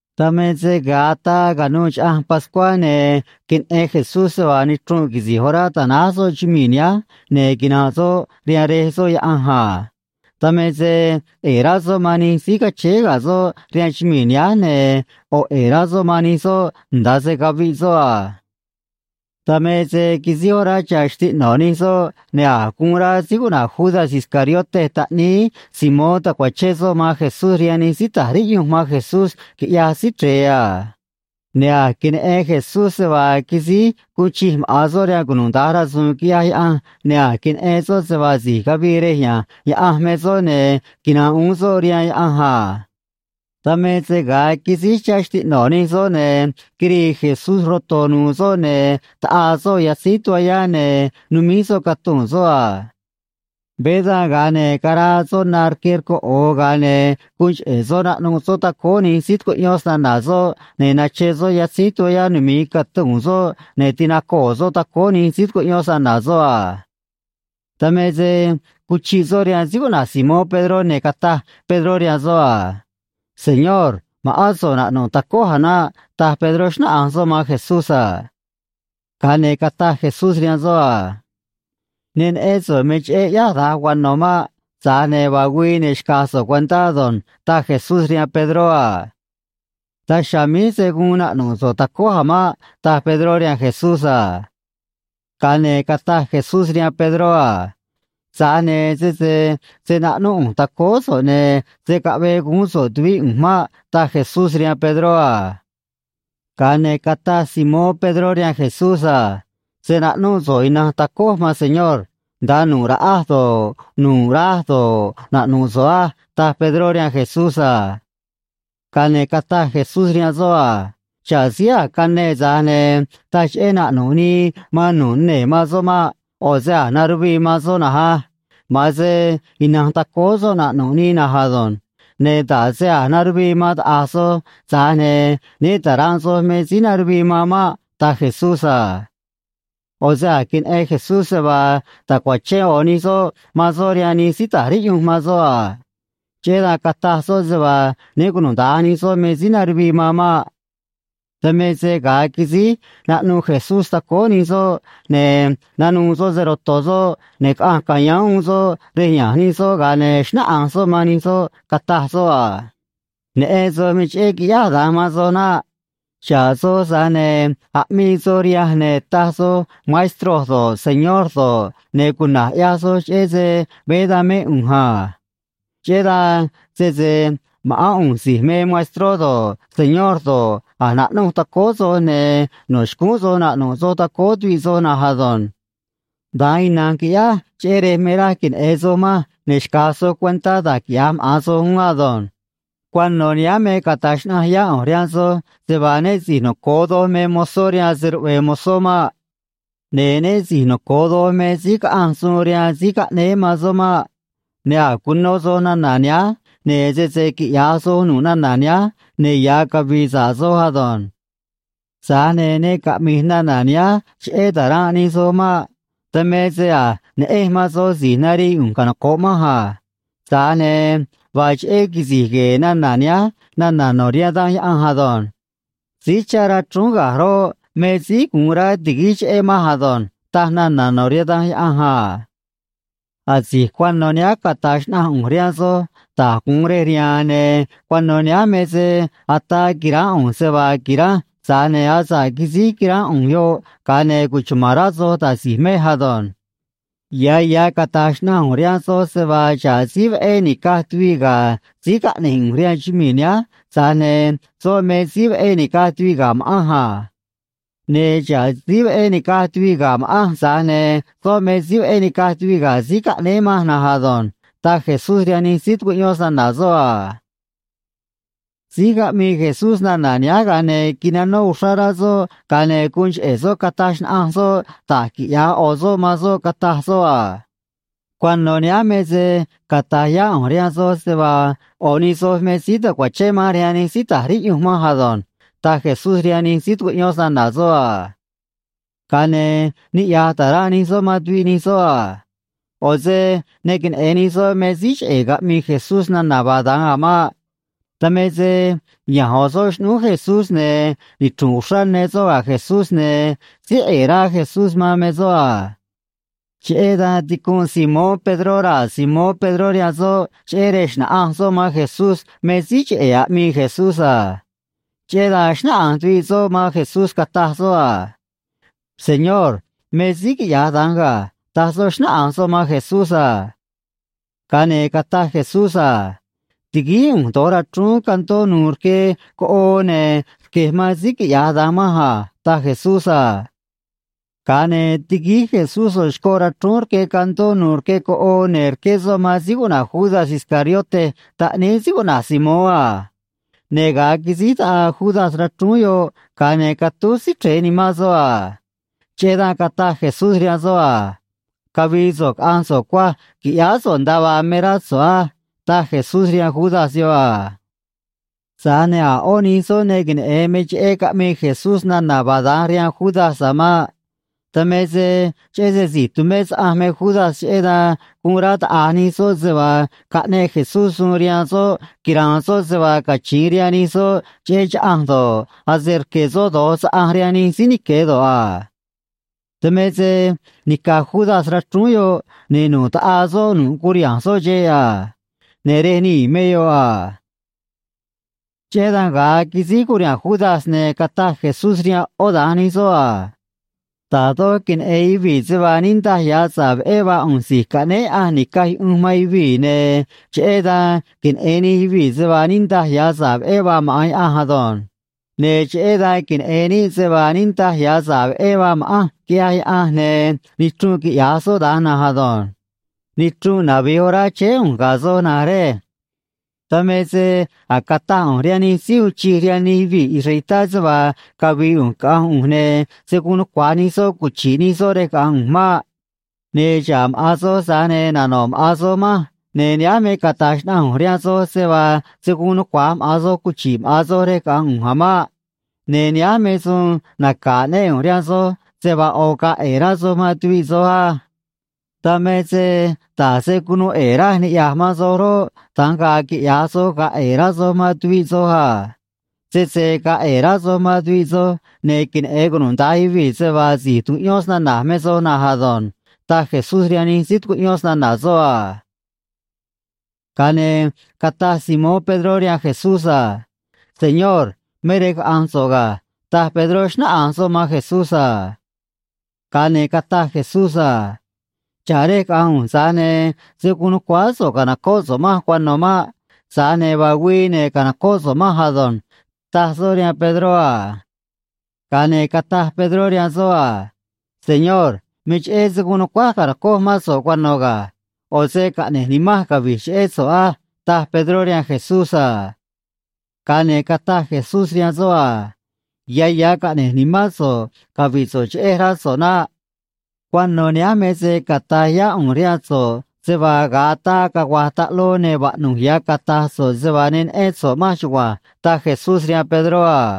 Dan me se ga̱a ataa ca̱nuû Chaꞌanj Pascuá, ne̱ queneꞌen Jesús se vaa nichrunꞌ quisi̱j orá ta̱náj soꞌ chumii̱ nihánj ne̱ quina̱nꞌ soꞌ rihaan Rej soꞌ Yaꞌanj a. Dan me se ꞌe̱e̱ rá soꞌ man nij síí cachéé ga̱ soꞌ rihaan chumii̱ nihánj, ne̱ ꞌo̱ ꞌe̱e̱ rá soꞌ man nij soꞌ nda̱a se caviꞌ soꞌ a. Dan me se quisíj orá chá xtiꞌno̱ nij soꞌ, ne̱ a̱j guun rá síí cuꞌna̱j Judas Iscariote taꞌníí Simón ta̱cuachén soꞌ man Jesús rihaan nij síí ta̱j riꞌyunj man Jesús, quiꞌyaj Síí Chre̱e a. Ne̱ a̱j queneꞌen Jesús se vaa quisíj guun chij maꞌa̱n soꞌ rihaan cunuda̱nj rasu̱u̱n, quiꞌyaj Yaꞌanj, ne̱ a̱j queneꞌen soꞌ se vaa si̱j cavii rej ya̱nj Yaꞌanj me soꞌ ne̱ quina̱nꞌ uún soꞌ rihaan Yaꞌanj a. Dan me se ga̱a quisíj chá xtiꞌno̱ nij soꞌ, ne̱ quirii Jesús roto̱ nu̱u̱ soꞌ, ne̱ taꞌaa soꞌ yatzíj toallá, ne̱ numíj soꞌ catuu̱n soꞌ a. Veé dan, ga̱a ne̱ caraa soꞌ na rque rcoꞌo̱o, ga̱a ne̱ guun cheꞌe̱ soꞌ naꞌnuꞌ soꞌ tacóó nij síí tucuꞌyón snana̱ soꞌ, ne̱ nachen soꞌ yatzíj toallá numi̱i catuu̱n soꞌ, ne̱ tinacoo̱ soꞌ tacóó nij síí tucuꞌyón snana̱ soꞌ a. Dan me se cuchiꞌ soꞌ rihaan síí cuꞌna̱j Simón Pedró, ne̱ cataj Pedró rihaan soꞌ a: ―Señor, ma̱ꞌán so̱ꞌ naꞌnu̱ꞌ tacój a̱ naꞌ ―taj Pedró, xnáꞌanj soꞌ man Jesús a. Ga̱a ne̱ cataj Jesús rihaan soꞌ a: ―Ne neꞌén so̱ꞌ me cheꞌé ꞌyáj da̱nj cuano̱ maꞌ. Tza̱j ne̱ vaa güii, ne̱ xca̱j so̱ꞌ cuentá ado̱nj ―taj Jesús rihaan Pedró a. ―Daj chiha̱a̱ míj se̱ guun naꞌnu̱ꞌ so̱ꞌ tacój a̱ maꞌ ―taj Pedró rihaan Jesús a. Ga̱a ne̱ cataj Jesús rihaan Pedró a: ―Tza̱j ne̱ sese se̱ naꞌnúꞌ ꞌu̱nj tacóó so̱ꞌ, ne̱ se̱ caꞌvee guún so̱ꞌ tuvíꞌ ꞌu̱nj maꞌ ―taj Jesús rihaan Pedró a. Ga̱a ne̱ cataj Simón Pedró rihaan Jesús a: ―Se̱ naꞌnúꞌ so̱ꞌ ina̱nj tacój, maan Señor. Nda̱a nu̱ꞌ raꞌaj do̱ꞌ, nu̱ꞌ raj do̱ꞌ, naꞌnu̱ꞌ so̱ꞌ á ―taj Pedró rihaan Jesús a. Ga̱a ne̱ cataj Jesús rihaan soꞌ a: ―Xa̱ꞌ síí a̱j cane, tza̱j ne̱ taj cheꞌé naꞌnu̱ꞌ nii man nu̱ꞌ nee̱ man soꞌ maꞌ. ꞌO̱ se a̱j naruvii man soꞌ na̱nj á. Ma̱an se ina̱nj tacóó soꞌ naꞌnu̱ꞌ nii na̱nj ado̱nj. Ne̱ nda̱ꞌ se a̱j naruvii man taꞌa̱j soj, tza̱j ne̱ né ta̱ranꞌ soj me síí naruvii man maꞌ ―taj Jesús a. ꞌO̱ se a̱j queneꞌen Jesús se vaa ta̱cuachén ꞌo̱ nij soꞌ man soꞌ rihaan nij síí ta̱j riꞌyunj man soꞌ a. Cheꞌé dan cataj soꞌ se vaa né cunuda̱nj nij soꞌ me síí naruvii man maꞌ. Dan me se ga̱a quisíj naꞌnuꞌ Jesús tacóó nij soꞌ, ne̱ nanuû soꞌ se‑ro̱to̱ soꞌ, ne̱ caꞌanj ca̱yáán uún soꞌ rej ya̱nj nij soꞌ, ga̱a ne̱ xnáꞌanj soꞌ man nij soꞌ, cataj soꞌ a: ―Neꞌen soj me cheꞌé quiꞌyáj da̱nj man soj naꞌ. Xa̱ꞌ soj, tza̱j ne̱ aꞌmii soj rihanj, ne̱ taj soj Maestro do̱ꞌ, Señor do̱ꞌ, ne̱ cuna̱j ꞌyaj soj cheꞌé se veé dan mé ꞌu̱nj a. Cheꞌé dan, sese ma̱ꞌán ꞌu̱nj si̱j me Maestró do̱ꞌ, Señor do̱ꞌ, a̱j naꞌnuꞌ tacóó soj, ne̱ no̱ xcúún soj naꞌnu̱ꞌ soj tacóó tuviꞌ soꞌ na̱nj ado̱nj. Da̱nj ina̱nj quiꞌyáj, cheꞌé rej me raj queneꞌe̱n soj manj, ne̱ xca̱j soj cuentá da̱j quiꞌya̱j maꞌa̱n soj uún ado̱nj. Cuano̱ nihánj me cata̱j xnaꞌanj yá ꞌu̱nj rihaan soj se vaa né si̱j noco̱o doj me mozó rihaan se‑ruꞌve̱e̱ mozó maꞌ. Ne̱ né si̱j noco̱o doj me síí caꞌanj suun rihaan síí caꞌnéé man soꞌ maꞌ. Ne̱ a̱j cuno soj nana̱ nihánj, ne̱ sese quiꞌya̱j soj nu̱ꞌ nana̱ nihánj, ne̱ ya̱ cavi̱i̱ sa̱ꞌ soj ado̱nj. ’Tza̱j ne̱ ne caꞌmi̱j nana̱ nihánj cheꞌé ta̱ranꞌ nij soj maꞌ. Dan me se a̱j neꞌenj man soj si̱j narii ꞌu̱nj canoco̱ꞌ manj a. Tza̱j ne̱ vaa cheꞌé quisi̱j gue̱e̱ nana̱ nihánj nana̱ no̱ rihaan Danj Yaꞌanj ado̱nj: “Síí chá rachrúún ga̱j roꞌ, me síí guun rá ti̱guíj cheꞌé manj ado̱nj”, taj nana̱ no̱ rihaan Danj Yaꞌanj a. ’Asi̱j cuano̱ nihánj cata̱j xnaꞌanj ꞌu̱nj rihaan soj da̱j gu̱un rej riha̱a̱n, ne̱ cuano̱ nihánj me se ataa qui̱ránꞌ ꞌu̱nj se vaa qui̱ranj, tza̱j ne̱ asa̱ꞌ quisíj quiránꞌ ꞌu̱nj yoꞌ, ga̱a ne̱ cuchuma̱n rá soj da̱j si̱j mej ado̱nj. Ya̱ ya̱ cata̱j xnaꞌanj ꞌu̱nj rihaan soj se vaa xa̱ꞌ síí veꞌé nica̱j tuviꞌ ga̱ síí caꞌne̱j ꞌu̱nj rihaan chumii̱ nihánj, tza̱j ne̱ soꞌ me síí veꞌé nica̱j tuviꞌ ga̱ ma̱ꞌanj a. Ne̱ xa̱ꞌ síí veꞌé nica̱j tuviꞌ ga̱ ma̱ꞌanj, tza̱j ne̱ soꞌ me síí veꞌé nica̱j tuviꞌ ga̱ síí caꞌnéé manj na̱nj ado̱nj ―taj Jesús rihaan nij síí tucuꞌyón snana̱ soꞌ a. Síj caꞌmii Jesús nana̱ nihánj, ga̱a ne̱ quinanó uxrá rá soꞌ, ga̱a ne̱ guun cheꞌe̱ soꞌ cataj xnaꞌanj soꞌ da̱j quiꞌya̱j ꞌo̱ soꞌ man soꞌ, cataj soꞌ a: ―Cuano̱ nihánj me se cata̱j yá ꞌu̱nj rihaan soj se vaa ꞌo̱ nij soj me síí ta̱cuachén manj rihaan nij síí ta̱j riꞌyunj manj ado̱nj ―taj Jesús rihaan nij síí tucuꞌyón snana̱ soꞌ a. Ga̱a ne̱ niꞌya̱j ta̱ranꞌ nij soꞌ man tuviꞌ nij soꞌ a. ꞌO̱ se ne queneꞌe̱n nij soꞌ me síí cheꞌe̱ caꞌmii Jesús nana̱ vaa da̱nj a̱ maꞌ. Dan me se ya̱nj ꞌo̱ soꞌ xꞌnúú Jesús, ne̱ nichru̱nꞌ uxrá ne soꞌ ga̱ Jesús, ne̱ síí ꞌe̱e̱ rá Jesús man me soꞌ a. Cheꞌé dan ticunꞌ Simón Pedró raa̱ Simón Pedró rihaan soꞌ, cheꞌé rej xna̱ꞌanj soꞌ man Jesús me síí cheꞌe̱ aꞌmii Jesús a. Cheꞌé dan xnáꞌanj tuviꞌ soꞌ man Jesús, cataj soꞌ a: ―Señor, me síí quiꞌya̱j da̱nj ga̱ ―taj soꞌ, xnáꞌanj soꞌ man Jesús a. Ga̱a ne̱ cataj Jesús a: ―Ti̱guíj ꞌu̱nj do̱j rachrúún candó nu̱u̱ rque coꞌoo, ne̱ rque̱j man síí quiꞌya̱j da̱nj manj a ―taj Jesús a. Ga̱a ne̱ tiguíj Jesús ꞌo̱ xcoꞌ rachrúún rque candó nu̱u̱ rque coꞌoo, ne̱ rqué soꞌ man síí cuꞌna̱j Judas Iscariote taꞌníí síí cuꞌna̱j Simón a. Ne̱ ga̱a quisíj taꞌaa Judas rachrúún yoꞌ, ga̱a ne̱ catúj Síí Chre̱e nimán soꞌ a. Cheꞌé dan cataj Jesús rihaan soꞌ a: ―Cavi̱i̱ so̱ꞌ caꞌa̱nj so̱ꞌ cuaj qui̱ꞌyáá so̱ꞌ nda̱a vaa me rá so̱ꞌ á ―taj Jesús rihaan Judas yoꞌ a. Tza̱j ne̱ a̱ ꞌó nij soꞌ ne queneꞌe̱n me cheꞌé caꞌmii Jesús nana̱ vaa da̱nj rihaan Judas a̱ maꞌ. Dan me se cheꞌé se si̱j tumé saꞌanj me Judas, cheꞌé dan guun rá taꞌa̱j nij soꞌ se vaa caꞌneꞌ Jesús suun rihaan soꞌ quira̱a̱n soꞌ se vaa cachi̱in rihaan nij soꞌ cheꞌé chaꞌanj do̱ꞌ, ase rque̱ soꞌ do̱j saꞌanj rihaan nij síí nique̱ do̱ꞌ a. Dan me se nica̱j Judas rachrúún yoꞌ, ne̱ nu̱ꞌ taꞌaa soꞌ nu̱ꞌ curiha̱nj soꞌ xeꞌ a. Ne̱ rej nii̱ me yoꞌ a. Cheꞌé dan ga̱a quisíj curiha̱nj Judas, ne̱ cataj Jesús rihaan ꞌó da̱nj nij soꞌ a: ―Da̱j doj queneꞌe̱n yuvii̱ se vaa niꞌndaj ya̱ sa̱ꞌ veꞌé vaa ꞌu̱nj Si̱j Caꞌnéé Yaꞌanj Ni̱caj Yuꞌunj man Yuvii̱, ne̱ cheꞌé dan queneꞌe̱n nij yuvii̱ se vaa niꞌndaj ya̱ sa̱ꞌ veꞌé vaa maꞌa̱n Yaꞌanj ado̱nj. Ne̱ cheꞌé dan queneꞌe̱n níꞌ se vaa niꞌndaj ya̱ sa̱ꞌ veꞌé vaa ma̱ꞌanj, quiꞌya̱j Yaꞌanj, ne̱ nichrunꞌ quiꞌya̱j soꞌ da̱nj na̱nj ado̱nj. Nichrunꞌ navi̱j orá chéé ꞌu̱nj ga̱ soj, na̱nj rej. Dan me se a̱j cataj ꞌu̱nj rihaan nij síí uun chij rihaan nij yuvii̱ israelitá se vaa cavi̱i̱ ꞌu̱nj caꞌa̱nj ꞌu̱nj, ne̱ se̱ guun nucua̱j nij soꞌ cuchi̱ꞌ nij soꞌ rej caꞌa̱nj ꞌu̱nj maꞌ. Ne̱ xa̱ꞌ maꞌa̱n soj, tza̱j ne̱ nano̱ꞌ maꞌa̱n soj manj, ne̱ nihánj me cata̱j xnaꞌanj ꞌu̱nj rihaan soj se vaa se̱ guun nucua̱j maꞌa̱n soj cuchi̱ꞌ maꞌa̱n soj rej caꞌa̱nj ꞌu̱nj a̱ maꞌ. Ne̱ nihánj me suun naca̱ aꞌnéꞌ ꞌu̱nj rihaan soj, se vaa ꞌo̱ ga̱a̱ ꞌe̱e̱ rá soj man tuviꞌ soj á. Dan me se da̱j se cunuu ꞌe̱e̱ raj niꞌya̱j man soj roꞌ, da̱nj ga̱a̱ quiꞌya̱j soj, ga̱a̱ ꞌe̱e̱ rá soj man tuviꞌ soj a. Sese ga̱a̱ ꞌe̱e̱ rá soj man tuviꞌ soj, ne̱ queneꞌe̱n cunuda̱nj yuvii̱ se vaa si̱j tucuꞌyón snana̱j me soj na̱nj ado̱nj ―taj Jesús rihaan nij síí tucuꞌyón snana̱ soꞌ a. Ga̱a ne̱ cataj Simón Pedró rihaan Jesús a: ―Señor, me rej caꞌa̱nj so̱ꞌ ga̱ ―taj Pedró, xnáꞌanj soꞌ man Jesús a. Ga̱a ne̱ cataj Jesús a: ―Xa̱ꞌ rej caꞌa̱nj ꞌu̱nj, tza̱j ne̱ se̱ guun nu̱cuáá so̱ꞌ ca̱nocóꞌ so̱ꞌ manj cuano̱ maꞌ. Tza̱j ne̱ vaa güii, ne̱ ca̱nocóꞌ so̱ꞌ manj ado̱nj ―taj soꞌ rihaan Pedró a. Ga̱a ne̱ cataj Pedró rihaan soꞌ a: ―Señor, me cheꞌé se̱ guun nu̱cuáj ca̱nocoj mán so̱ꞌ cuano̱ ga̱. ꞌO̱ se caꞌne̱j nimanj cavi̱j cheꞌé so̱ꞌ á ―taj Pedró rihaan Jesús a. Ga̱a ne̱ cataj Jesús rihaan soꞌ a: ―Ya̱ ya̱ caꞌne̱j nimán so̱ꞌ cavi̱ꞌ so̱ꞌ cheꞌej, rá so̱ꞌ naꞌ. Cuano̱ nihánj me se cata̱j yá ꞌu̱nj rihaan so̱ꞌ se vaa ga̱a ataa cagua̱j taꞌloo, ne̱ vaꞌnu̱j ya̱ cata̱j so̱ꞌ se vaa ne neꞌén so̱ꞌ manj chugua̱nj ―taj Jesús rihaan Pedró a.